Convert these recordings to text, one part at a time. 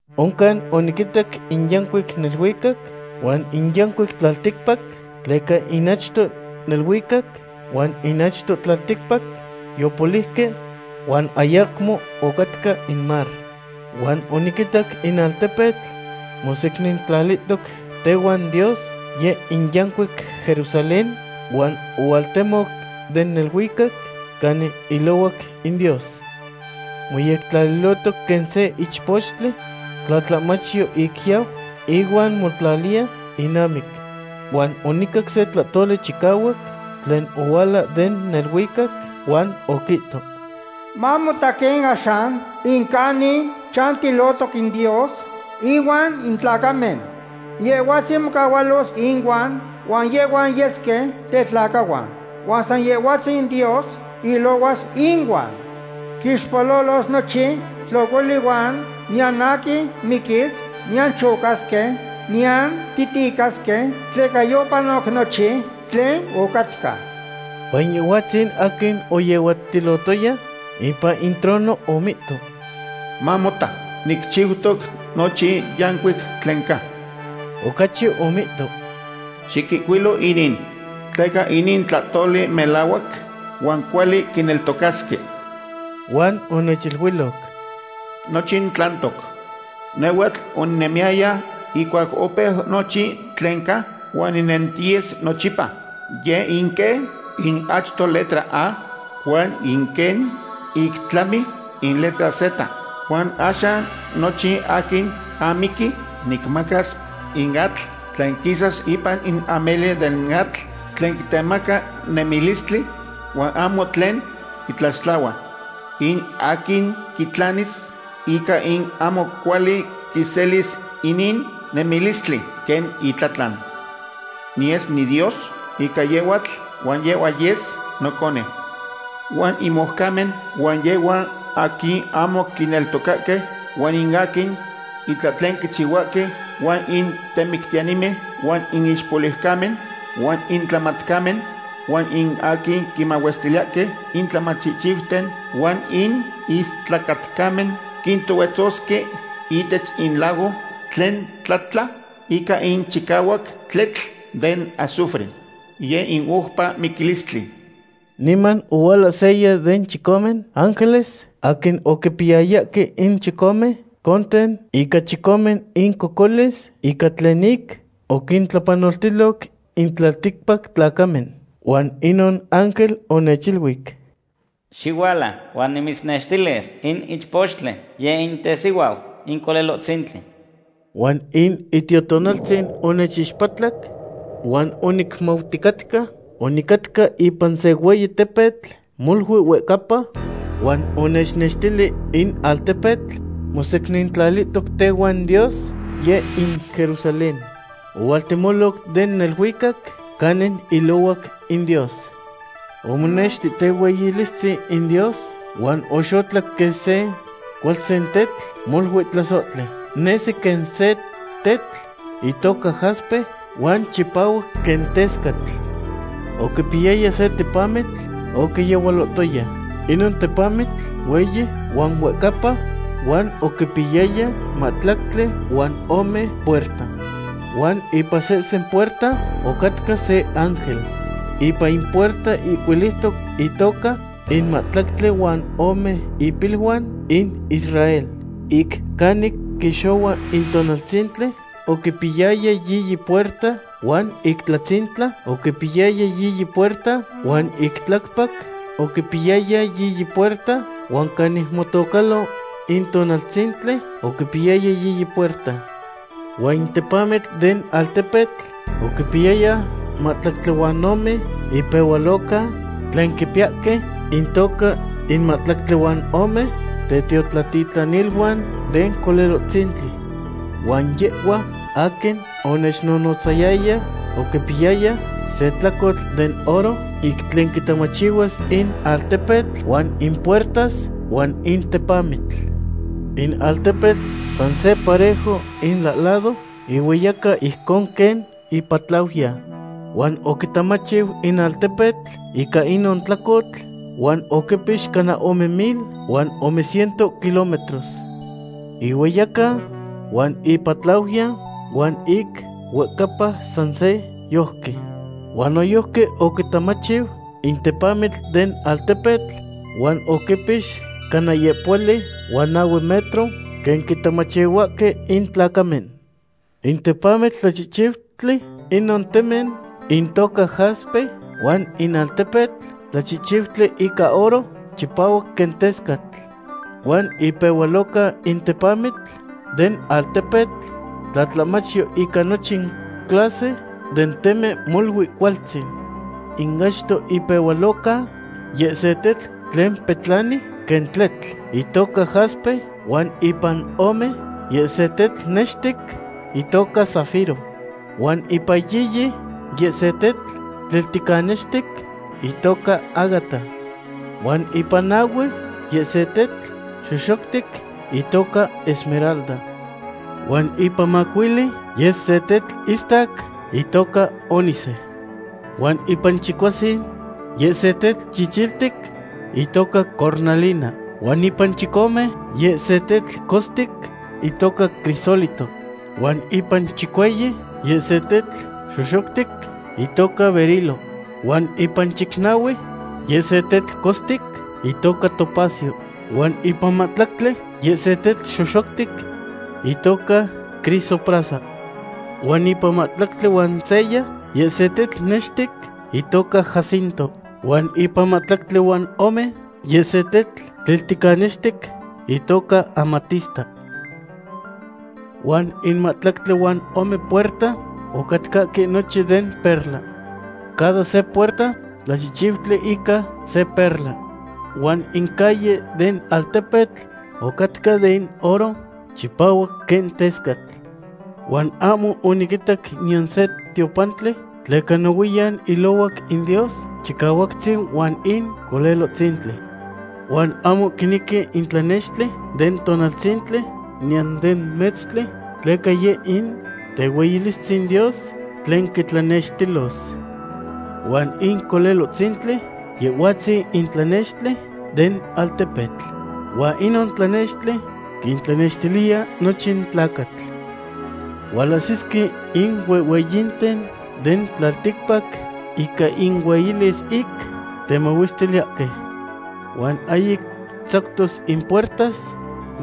Oncan oniquitac in yancuic neluicac huan in yancuic tlalticpac, tleca in achto neluicac huan in achto tlalticpac yopoliuque huan ayacmo ocatca in mar. Huan oniquitac in altepetl mosecnintlalihtoc tehuan Dios, yeh in yancuic Jerusalén, huan ohualtemoc den neluicac canin ilohuac in Dios. Moyectlalihtoc quen se ichpochtli tlatlahmachyo ic yau ihuan motlaliya inamic. Huan onicac se tlahtoli chicahuac tlen ohuala den neluicac, huan oquihto: ―Mamota quen axan in canin chantilotoc in Dios inuan in tlacamen. Yehhuatzin mocahualos inuan, huan yehhuan yesque tetlacahuan. Huan san Yehhuatzin Dios ilohuas inuan. Quixpololos nochin tlocoli huan niyan aquin miquis, niyan chocasque, niyan titicasque, tleca yopanoc nochin tlen ocatca. Huan Yehhuatzin aquin oyehuatilotoya ipan in trono omihto: ―Mamota, nicchiutoc nochin yancuic tlen ca. Ocachi omihto: ―Xiquihcuilo inin, tleca inin tlahtoli melahuac huan cuali quineltocasque. Huan onechiluiloc: ―¡Nochin tlantoc! Nehhuatl oninemiyaya ihcuac opeu nochin tlen ca, huan ninentiyes nochipa. Yeh in quen in achto letra A huan in quen ic tlami in letra Z. Huan axan nochin aquin amiqui nicmacas in atl tlen quisas ipan in ameli den atl tlen quitemaca nemilistli, huan ahmo tlen quitlaxtlahua. In aquin quitlanis ica in ahmo cuali quiselis inin nemilistli quen itlatlan. Niyes niDios ica yehhuatl huan yehhua yes noconeu. Huan in moucamen, huan yehhuan aquin ahmo quineltocahque, huan in aquin itlahtlen quichihuahque huan in temictiyanimen, huan in ixpoliucamen, huan in tlamatcamen, huan in aquin quimahuestiliyahque in tlamachihchiuten, huan in istlacatcamen, quintohuetzosque ihtech in lago tlen tlatla ica in chicahuac tletl den azufre. Yeh in oupa miquilistli. Niman ohuala seya den chicome ángeles aquin oquipiyayahque in chicome conten ica chicome incocolis ica tlen ic oquintlapanoltiloc in tlalticpac tlacamen. Huan inon ángel onechiluic: ―Xihuala, huan nimitznextilis in ichpochtli, yeh in tesihuau in Colelohtzintli. Huan in Itiotonaltzin onechixpatlac huan onicmauticatca onicatca ipan se hueyi tepetl molui huehcapa, huan onechnextili in altepetl mosecnintlalihtoc tehuan Dios, yeh in Jerusalén. Ohualtemoc den neluicac canin ilohuac in Dios. Omonexti tehueyilistzin in Dios huan oxotlac quen se cualtzin tetl, molui tlasohti. Nesi quen se tetl itoca jaspe huan chipahuac quen tescatl. Oquipiyaya se tepamitl oquiyehualohtoya. Inon tepamitl hueyi huan huehcapa, huan oquipiyaya mahtlactli huan ome puerta. Huan ipan sehsen puerta ocatca se ángel. Ipan in puerta ihcuiliutoc intoca in mahtlactli huan ome ipiluan in Israel. Ic canic quixohua in tonaltzintli oquipiyaya yiyi puerta, huan ic tlatzintla oquipiyaya yiyi puerta, huan ic tlacpac oquipiyaya yiyi puerta, huan canic motocalo in tonaltzintli oquipiyaya yiyi puerta. Huan in tepamitl den altepetl oquipiyaya mahtlactli huan ome ipehualoca tlen quipiyahque intoca in mahtlactli huan ome tetiotlatitlaniluan den Colelohtzintli. Huan yehhua aquin onechnohnotzayaya oquipiyaya se tlacotl den oro ic tlen quitamachihuas in altepetl huan in puertas, huan in tepamitl. In altepetl san se parejo ilahlado, ihueyaca ijcon quen ipatlauya. Huan oquitamachiu in altepetl ica inon tlacotl, huan oquipix cana ome mil huan ome ciento kilómetros. Ihueyaca huan ipatlauya huan ic huehcapa san se yojqui. Huan noyojqui oquitamachiu in tepamitl den altepetl huan oquipix cana yehpohuali huan nahue metro, quen quitamachihuahque in tlacamen. In tepamitl tlachihchiutli inon temen intoca jaspe huan in altepetl tlachihchiutli ica oro chipahuac quen tescatl. Huan impehualoca in tepamitl den altepetl tlatlahmachyo ica nochin clase den temen molui cualtzin. In achto ipehualoca, yeh se tetl tlen petlani quen tletl, itoca jaspe, huan ipan ome, yeh se tetl nextic itoca zafiro. Huan ipan yiyi, yeh se tetl tlilticanextic itoca ágata. Huan ipan nahue, yeh se tetl xoxoctic itoca esmeralda. Huan ipan macuili, yeh se tetl istac itoca ónice. Huan ipan chicuasin, yeh se tetl chichiltic itoca cornalina. Huan ipan chicome, yeh se tetl costic itoca crisólito. Huan ipan chicueyi, yeh se tetl xoxoctic itoca berilo. Huan ipan chicnahue, yeh se tetl costic itoca topacio. Huan ipan mahtlactli, yeh se tetl xoxoctic itoca crisoprasa. Huan ipan mahtlactli huan seya, yeh se tetl nextic itoca jacinto. Huan ipan mahtlactli huan ome, yeh se tetl tlilticanextic itoca amatista. Huan in mahtlactli huan ome puerta ocatcahque nochin den perla. Cada se puerta tlachihchiutli ica se perla. Huan in calle den altepetl ocatca den oro chipahuac quen tescatl. Huan ahmo oniquitac niyan se tiopantli, tleca nohuiyan ilohuac in Dios Chicahuactzin huan in Colelohtzintli. Huan ahmo quinequi in tlanextli den tonaltzintli niyan den metztli, tleca yeh in tehueyilistzin Dios tlen quitlanextilos. Huan in Colelohtzintli, Yehhuatzin in tlanextli den altepetl. Huan inon tlanextli quintlanextiliya nochin tlacatl. Hualahsisque in huehhueyinten den tlalticpac ica inueyilis ic temahuestiliyahque. Huan ahyic tzactos in puertas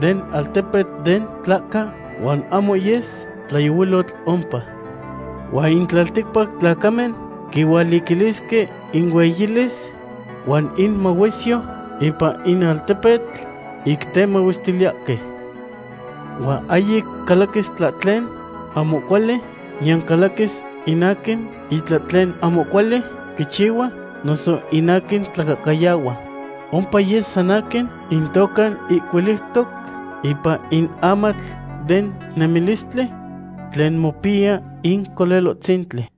den altepetl den tlahca, huan ahmo yes tlayohuilotl ompa. Huan in tlalticpac tlacamen quihualiquilisque inueyilis huan inmahuesyo ipan in altepetl ic temahuestiliyahque. Huan ahyic calaquis tlahtlen ahmo cuali, niyan calaquis in aquin itlahtlen ahmo cuali quichihua noso in aquin tlacahcayahua. Ompa yes san aquin intoca ihcuiliutoc ipan in amatl den nemilistli tlen mopiya in Colelohtzintli.